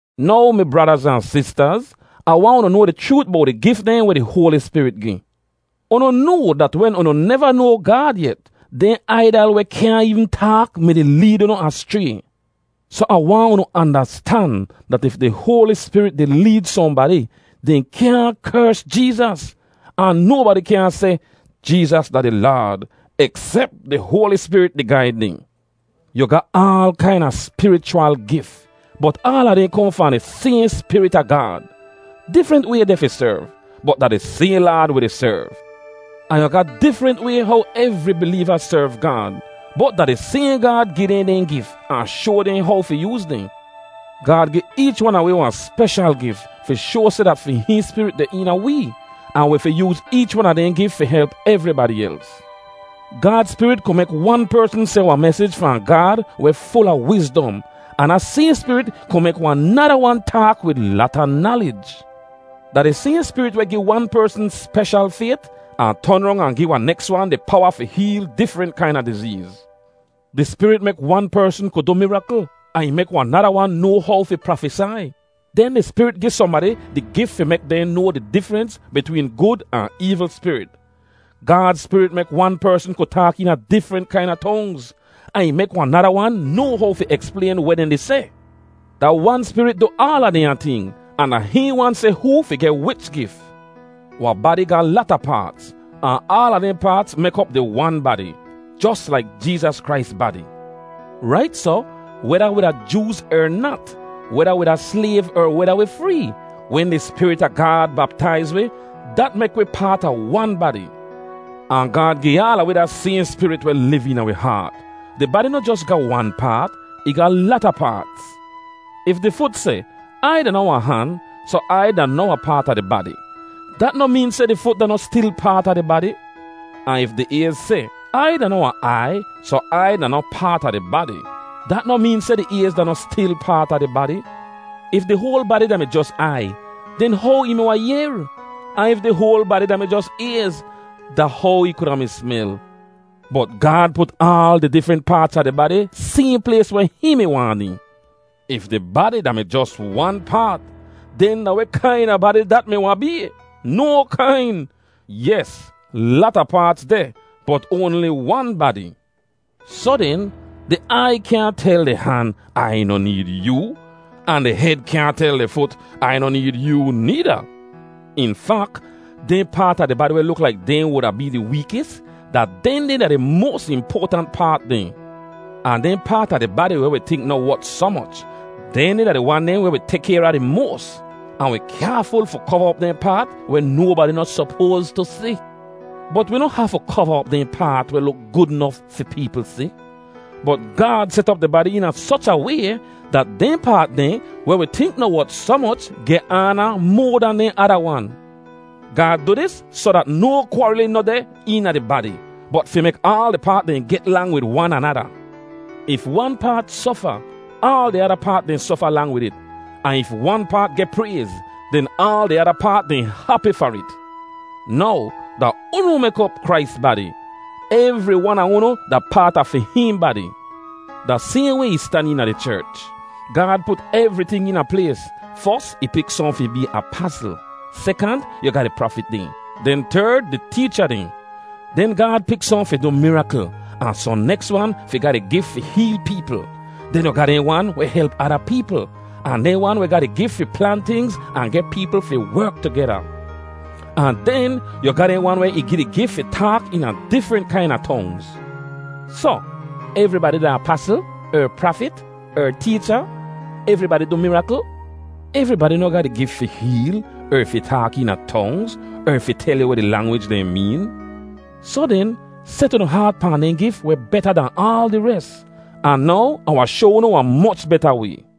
Now, mi bradaz ahn sistaz, Ah waahn unu noa di chroot bowt di gif dehn weh di Hoali Spirit gi. Unu noa dat wen unu neva noa Gaad yet, dehn aidal weh kyaahn eevn taak mi-di leed unu aschray. Soh Ah waahn unu andastan dat if di Hoali Spirit di leed sohnbadi, dehn kyaahn kers Jeezas; ahn nobadi kyaahn seh, “Jeezas da di Laad,” eksep di Hoali Spirit di gaid dehn. Yu ga aal kaina spirichwal gif, bot aala dehn kohn fahn di sayhn Spirit a Gaad. Difrent way deh fi serv, bot da di sayhn Laad wi di serv. Ahn yu ga difrent way how evri bileeva serv Gaad, bot da di sayhn Gaad gi dehn dehn gif ahn shoa dehn how fi yooz dehn. Gaad gi eech wan a wi wahn speshal gif fi shoa seh dat fi hihn Spirit deh eena wee, ahn wi fi yooz eech wan a dehn gif fi help evribadi els. Gaad Spirit ku mek wan persn seh wahn mesij fahn Gaad weh ful a wizdom, ahn da sayhn Spirit ku mek wahn nada wan taak wid lata nalij. Da di sayhn Spirit weh gi wan persn speshal fayt, ahn ton rong ahn gi wahn neks wan di powa fi heel difrent kaina dizeez. Di Spirit mek wan persn ku du mirakl, ahn ih mek wahn nada wan noa how fi prafesai; den di Spirit gi sohnbadi di gif fi mek dehn noa di difrens bitween gud ahn eevl spirit. Gaad Spirit mek wan persn ku taak eena difrent kaina tongz, ahn ih mek wahn nada wan noa how fi eksplayn weh dehn di seh. Da wan Spirit du aala dehnya ting, ahn da hihn wan seh hoo fi geh wich gif. Wahn badi ga lata paats, ahn aala dehn paats mek op di wan badi, jos laik Jeezas Krais badi. Rait soh, weda wi da Jooz er nat, weda wi da slayv er weda wi free, wen di Spirit a Gaad baptaiz wi, dat mek wi paat a wan badi; ahn Gaad gi aala wi da sayhn Spirit weh liv eena wi haat. Di badi noh jos ga wan paat. Ih ga lata paats. If di fut seh, “Ai da noh wahn han, soh Ai da noh wahn paat a di badi,” dat noh meen seh di fut da noh stil paat a di badi. Ahn if di ayz seh, “Ai da noh wahn aiy, soh Ai da noh paat a di badi,” dat noh meen seh di ayz da noh stil paat a di badi. If di hoal badi da-mi jos aiy, den how ih mi wahn yehr? Ahn if di hoal badi da-mi jos ayz, da how ih kuda mi smel? Bot Gaad put aal di difrent paats a di badi sayhn plays weh hihn mi waahn dehn. If di badi da-mi jos wan paat, den da weh kaina badi dat mi wahn bee? No kain! Yes, lata paats deh, bot oanli wan badi. Soh den, di aiy kyaahn tel di han, “Ai noh need yoo!” Ahn di hed kyaahn tel di fut, “Ai noh need yoo,” needa. In fak, dehn paat a di badi weh luk laik dehn wuda bee di weekis, da dehndeh da di moas impoatant paat dehn. Ahn dehn paat a di badi weh wi tink noh wot soh moch, dehndeh da di wan dehn weh wi tek kayr a di moas. Ahn wi kyaaful fi kova op dehn paat weh nobadi noh sopoas tu si. Bot wi noh hafu kova op dehn paat weh luk gud nof fi peepl si. Bot Gaad set op di badi eena soch a way dat dehn paat dehn weh wi tink noh wot soh moch geh aana moa dan dehn ada wan. Gaad du dis soh dat no kwaarilin noh deh eena di badi, bot fi mek aal di paat dehn get lang wid wan anada. If wan paat sofa, aal di ada paat dehn sofa lang wid it, ahn if wan paat geh prayz, den aal di ada paat dehn hapi far it. Now, da unu mek op Krais badi. Evri wan a unu da paat a fi hihn badi. Da sayhn way ih stan eena di cherch. Gaad put evriting eena plays: fos ih pik sohn fi bee apasl; sekant, yu ga di prafit dehn; den terd, di teecha dehn. Den Gaad pik sohn fi du mirakl, ahn sohn neks wan fi ga di gif fi heel peepl. Den yu ga dehn wan weh help ada peepl, ahn dehn wan weh ga di gif fi plan tingz ahn geh peepl fi werk tugeda. Ahn den, yu ga dehn wan weh ih gi di gif fi taak eena difrent kaina tongz. Soh, evribadi da apasl? er prafit? er teecha? Evribadi du mirakl? Evribadi noh ga di gif fi heel, er fi taak eena tongz, er fi tel yu weh di langwij dehn meen. Soh den, set unu haat pahn dehn gif weh beta dahn aal di res. Ahn now, Ah wahn shoa unu wahn moch beta way.